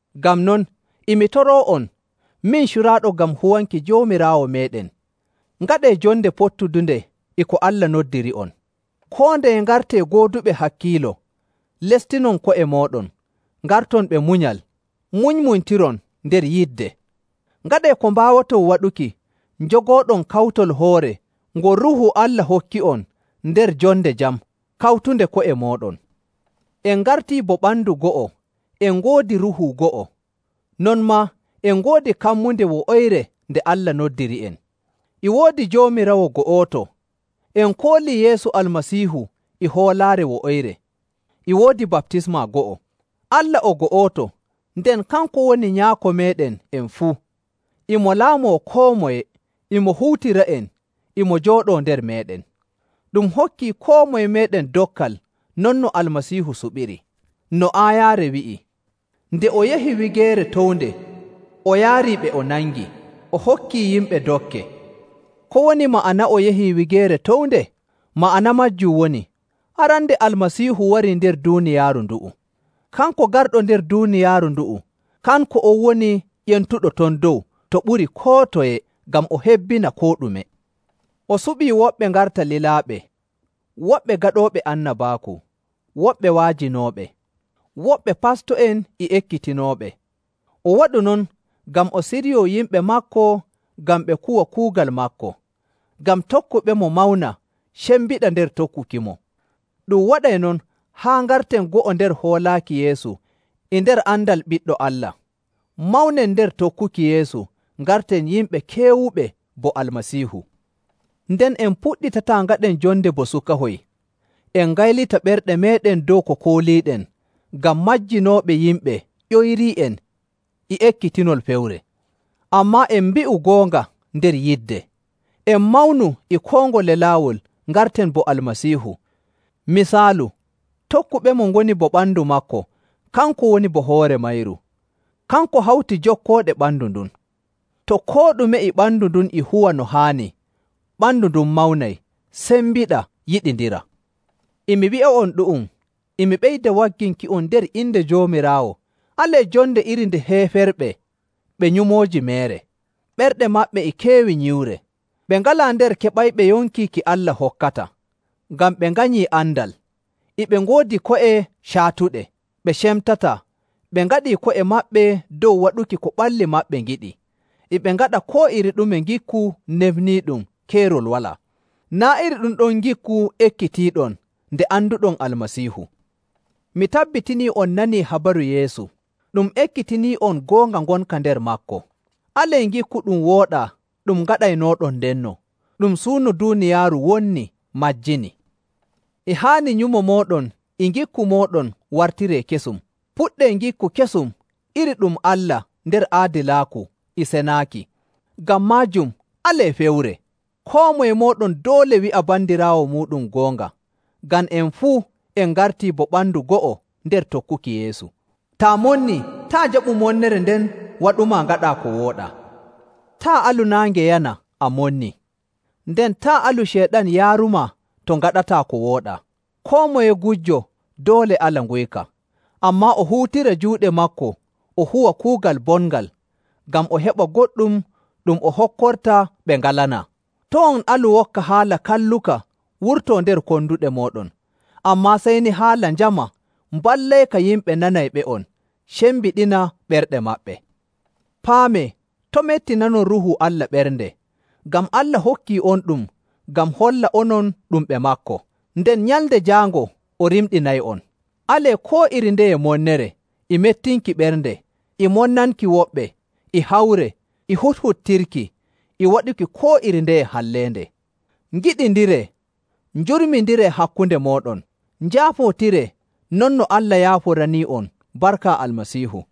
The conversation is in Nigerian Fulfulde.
Ngam non, e mi toroo'on, min curaaɗo ngam huwanki Joomiraawo meeɗen, ngaɗee jonde pottudunde e ko Allah noddiri'on. Koo ndeye ngartee gooduɓe hakkiilo, lestinon ko'e mooɗon, ngarton ɓe munyal, munymunytiron nder yidde.. Ngaɗee ko mbaawoton waɗuki njogooɗon kawtol hoore ngol Ruuhu Allah hokki'on nder jonde jam kawtunde ko'e mooɗon. En ngartii bo ɓandu go'o, en ngoodi Ruuhu go'o, non maa en ngoodi kammunde wo'oyre nde Allah noddiri'en. E woodi Joomiraawo go'oto, en koolii Yeesu Almasiihu e hoolaare wo'oyre, e woodi baptisma go'o. Allah o go'oto, nden kanko woni Nyaako meeɗen en fuu, e mo laamoo koo moye, e mo huutira'en, e mo jooɗoo nder meeɗen. Ɗum hokkii koo moye meeɗen dokkal non no Almasiihu suɓiri. No aayaare wi'i, “Nde o yahi wigeere townde, o yaarii ɓe o nangi, o hokkii yimɓe dokke.”. Ko woni ma'ana o yahi wigeere townde? Ma'ana maajum woni, arande Almasiihu warii nder duuniyaaru ndu'u. Kanko garɗo nder duuniyaaru ndu'u, kanko on woni ƴentuɗo ton dow to ɓuri koo toye ngam o hebbina koo ɗume. O suɓii woɓɓe ngarta lilaaɓe, woɓɓe gaɗooɓe annabaaku, woɓɓe wa'ajinooɓe, woɓɓe pasto'en e ekkitinooɓe. O waɗu non ngam o siryoo yimɓe maako ngam ɓe kuwa kuugal maako, ngam tokkuɓemo mawna, cembiɗa nder tokkukimo. Ɗum waɗay non haa ngarten go'o nder hoolaaki Yeesu e nder andal Ɓiɗɗo Allah, mawnen nder tokkuki Yeesu, ngarten yimɓe keewuɓe bo Almasiihu. Nden en puɗɗitataa ngaɗen jonde bo sukahoy, en ngaylita ɓerɗe meeɗen dow ko kooliiɗen ngam majjinooɓe yimɓe ƴoyrii'en e ekkitinol fewre. Ammaa en mbi'u goonga nder yidde, en mawnu e koo ngole laawol ngarten bo Almasiihu. Misaalu, tokkuɓemo ngoni bo ɓandu maako, kanko woni bo hoore mayru. Kanko hawti jokkooɗe ɓandu ndun. To koo ɗume e ɓandu ndun e huwa no haani, ɓandu ndun mawnay, sembiɗa, yiɗindira.. E mi wi'a'on ɗu'um, e mi ɓeyda wagginki'on nder inde Joomiraawo, alee jonde iri nde heeferɓe ɓe nyumooji meere. Ɓerɗe maɓɓe e keewi nyiwre. Ɓe ngalaa nder keɓayɓe yonki ki Allah hokkata, ngam ɓe nganyii andal, e ɓe ngoodi ko'e caatuɗe. Ɓe cemtataa, ɓe ngaɗii ko'e maɓɓe dow waɗuki ko ɓalli maɓɓe ngiɗi, e ɓe ngaɗa koo iri ɗume ngikku nefniiɗum keerol walaa. Naa' iri ɗum ɗon ngikku ekkitiiɗon nde anduɗon Almasiihu! Mi tabbitinii on nanii habaru Yeesu. Ɗum ekkitinii'on goonga ngonka nder maako. Alee ngikku ɗum wooɗaa ɗum ngaɗaynooɗon ndenno, ɗum suuno duuniyaaru wonni, majjini.. E haani nyumo mooɗon e ngikku mooɗon wartiree kesum. Puɗɗee ngikku kesum iri ɗum Allah nder aadilaaku e cenaaki.. Ngam maajum alee fewre! Koo moye mooɗon doole wi'a bandiraawo muuɗum goonga, ngam en fuu en ngartii bo ɓandu go'o nder tokkuki Yeesu.. Taa monnii, taa' jaɓu monnere nden waɗumaa ngaɗaa ko wooɗaa. Taa' alu naange yana a monni.. Nden taa' alu Ceyɗan yaarumaa to ngaɗataa ko wooɗaa. Koo moye gujjo doole ala nguyka. Ammaa o huutira juuɗe maako o huwa kuugal bongal, ngam o heɓa goɗɗum ɗum o hokkorta ɓe ngalanaa. To' on alu wokka haala kalluka wurtoo nder konduɗe mooɗon, ammaa sey ni haala njama mballayka yimɓe nanayɓe'on cembiɗina ɓerɗe maɓɓe. Paamee, to' mettinanon Ruuhu Allah ɓernde, ngam Allah hokkii'onɗum ngam holla onon ɗum ɓe maako, nden Nyalnde Jaango o rimɗinay'on. Alee koo iri ndeye monnere, e mettinki ɓernde, e monnanki woɓɓe, e hawre, e huɗhuɗtirki, e waɗuki koo iri ndeye halleende. Ngiɗindiree, njurminindiree hakkunde mooɗon, njaafootiree non no Allah yaaforanii'on barka Almasiihu..